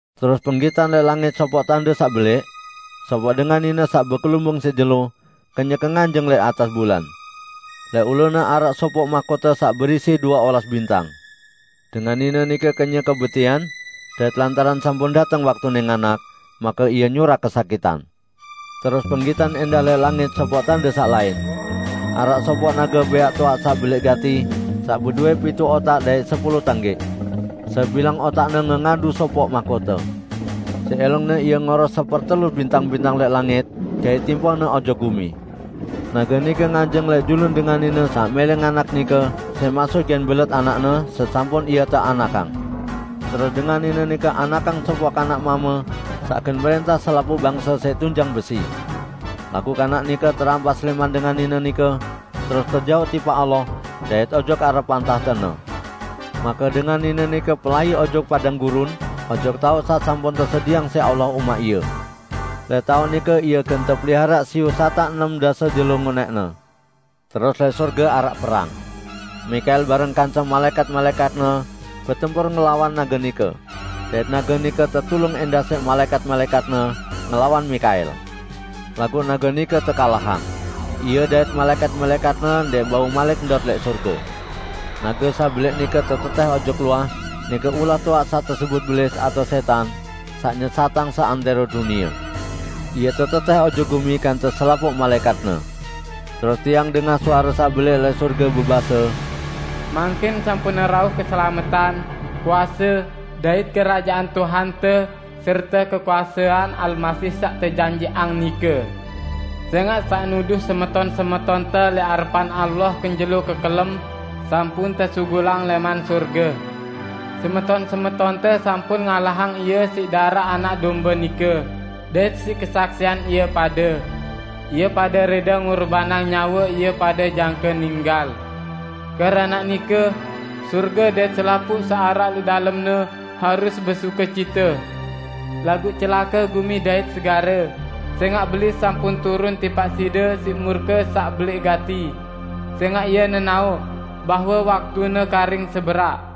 Terus penggitan lẽq langit sopoq tande saq belẽq. Sopoq dengan nine saq bekelumbung siq jelo, kenyeke nganjeng lẽq atas bulan. Lẽq ulune araq sopoq mahkote saq berisi due olas bintang. Dengan nine nike kenyeke betian, dait lantaran sampun dateng waktune nganak, make ie nyurak kesakitan. Terus penggitan ẽndah lẽq langit sopoq tande saq lain. Araq sopoq nage bẽaq toaq saq belẽq gati saq bedowẽ pituq otak dait sepulu tanggẽq. Sebilang otakne ngengadu sopoq mahkote. Siq ẽlongne ie ngoros sepertelu bintang-bintang lẽq langit dait timpohne ojok gumi. Nage nike nganjeng lẽq julun dengan nine saq mẽlẽ nganak nike siq maksut gen belet anakne, sesampun ie teanakang. Terus dengan nine nike anakang sopoq kanak mame saq gen mrẽntah selapuq bangse siq tunjang besi. Laguq kanak nike terampas lẽman dengan nine nike, terus tejauq tipaq Allah dait ojok arepan tahte-Ne. Make dengan nine nike pelai ojok padang gurun, ojok taoq saq sampun tesedieang siq Allah umaq ie. Lẽq taoq nike ie gen tepeliharaq siyu satak enem dase jelo ngonẽqne. Terus lẽq sorge araq perang. Mikael bareng kance malaẽkat-malaẽkatne betempur ngelawan nage nike. Dait nage nike tetulung ẽndah siq malaẽkat-malaẽkatne, ngelawan Mikael. Laguq nage nike tekalahang. Ie dait malaẽkat-malaẽkatne ndẽq bau malik ndot lẽq sorge. Nage saq belẽq nike tetetẽh ojok luah, nike ulah toaq saq tesebut Belis atao Sẽtan, saq nyesatang seantẽro dunie. Ie tetetẽh ojok gumi kance selapuq malaẽkatne. Terus tiang dengah suare saq belẽq lẽq sorge bebase, "Mangkin sampun rauh keselametan, kuase, dait Kerajaan Tuhante serte kekuasean Almasih saq tejanjiqang nike. Sẽngaq saq nuduh semeton-semetonte lẽq arepan Allah kenjelo kekelem sampun tesugulang lẽman sorge. Semeton-semetonte sampun ngalahang ie siq daraq Anak Dombe nike, dait siq kesaksian ie pade. Ie pade rẽde ngurbanang nyawe ie pade jangke ninggal. Keranaq nike, sorge dait selapuq saq araq lẽq dalemne harus besukecite! Laguq celake gumi dait segare, sẽngaq Belis sampun turun tipaq side siq murke saq belẽq gati, sẽngaq ie nenaoq bahwe waktune karing seberaq."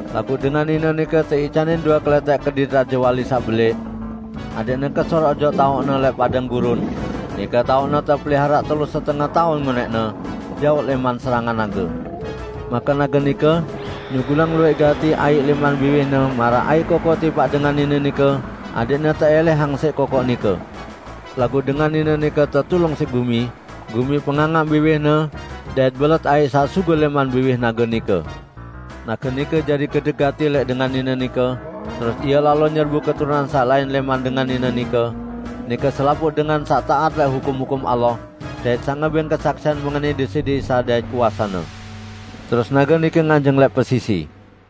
Laguq dengan nine nike teican due kelẽtẽk kedit rajewali saq belẽq, adẽqne kesur ojok taoqne lẽq padang gurun, nike taoqne tepeliharaq telu setenge taun ngonẽqne, jaoq lẽman serangan nage. Make nage nike nyugulang luwẽq gati aiq lẽman biwihne maraq aiq kokoq tipaq dengan nine nike adẽqne teẽlẽhang siq kokoq nike. Laguq dengan nine nike tetulung siq gumi; gumi pengangaq biwihne dait belet aiq saq sugul lẽman biwih nage nike. Nage nike jari gedek gati lẽq dengan nine nike, terus ie lalo nyerbu keturunan saq lain lẽman dengan nine nike, nike selapuq dengan saq taat lẽq hukum-hukum Allah, dait saq ngebẽng kesaksian mengenai Deside Isa dait kuase-Ne. Terus nage nike nganjeng lẽq pesisi.